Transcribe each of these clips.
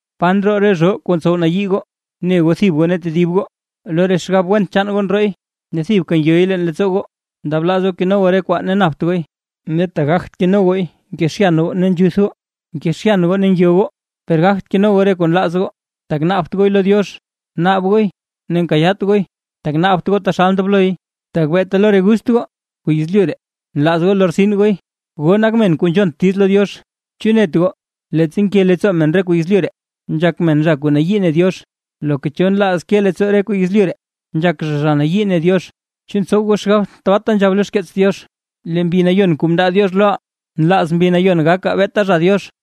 ¿Pa ndroo re zhoo kuu ntsow nayii goo ne goo thib goo ne tedib goo? Lo re xgab went chaan goo ndrooy ne thibka ngyoy leen leettsoo goo. Ndablaaz goo keno goo re kwaa ne napt gooy, ne tak gagt keno gooy nkezhyan goo ne nzhuth goo. Nkezhyan goo ne ngyo goo, per gagt keno goo re kuu nlaaz goo, tak naabt gooy lo Diox. Naab gooy ne nkayaat gooy, tak naabt gooy taxal ndobloy; tak beeta lo re gust goo kuu yezlyu ree nlaaz goo lortsin gooy. ¡Goo nak men kuu nzhont diiz lo Diox! ¿Chu net goo, leettsa nke leettsoo men re kuu yezlyu ree, nzhak men zha kuu nayii ne Diox? Loka cho nlaaz ke leettsoo re kwaa yezlyu ree, nzhak zha, zha nayii ne Diox. ¿Chu ntsow goo xgab tabaata nzhab lo xkeets Diox: “Lee Mbi Nayon kuu mndaa Diox loʼaa, nlaaz Mbi Nayon gakaa beeta zha Diox”?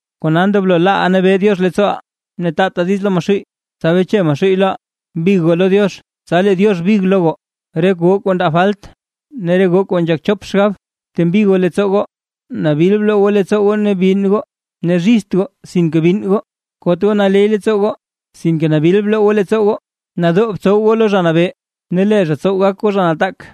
Kona ndoblo laaʼaa nabee Diox leettsooʼaa, ne taataa diiz lo Maxuuy, tsa beche Maxuuy loʼaa. Big goo lo Diox, tsa lee Diox big lo goo. Re goo kuu ndaa falt ne re goo kuu nzhak chop xgab, btembi goo leettsoo goo. Nabil bloo goo leettsoo goo ne binn goo. Ne zhizt goo sinke binn goo, kot goo naley leettsoo goo sinke nabil bloo goo leettsoo goo. Nadoo btsow goo lo Zha Nabee, ne lee zha tsow gak goo zha nataak.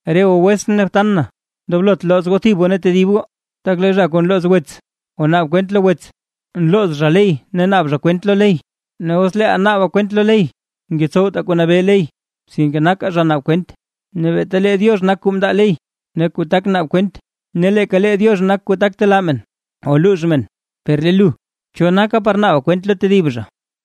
Re goo wetsʼn ne btan na, ndoblot looz goo thib goo ne tedib goo. Tak lee zha kuu nlooz wets o naab kwent lo wets, nlooz zha ley ne naab zha kwent lo ley. Ne os leeʼa naaba kwent lo ley, ngetsowta kuu nabee ley, sinke naka zha naab kwent. Ne beeta lee Diox nak kuu mndaa ley ne kuu tak naab kwent, ne leeka Diox nak kuu tak telaa men o luux men. Per lee lu, ¿cho naka par naaba kwent lo tedib zha?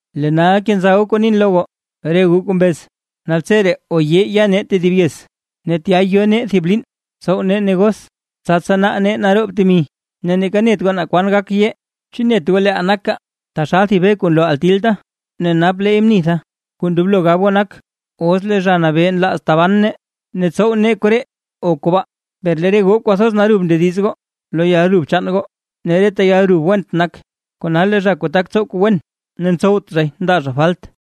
Lee nal kenza goo kuu nin lo goo. Re goo kuu mbez: “Naltseree o yee yaa nee thib yez, ne tya yo nee thib liin tsow nee negos, tsa tsanaa nee naroob temi”, ne neeka net goo naa kwan gak yee. ¿Chu net goo leeʼaa nakaa, taxal thib be kuu nloo gatilta, ne nap leey mnitha? Kuu ndoblo gab goo nak: “Os lee Zha Nabee nlaaz taban nee ne tetsow nee koree o kobaa”. Per lee re goo kwathoz narub ndediz goo lo yalrub chaan goo; ne reta yalrub went nak. Kona lee zha kuu tak tsow kuu wen ne ntsowt zhay ndaa zha falt.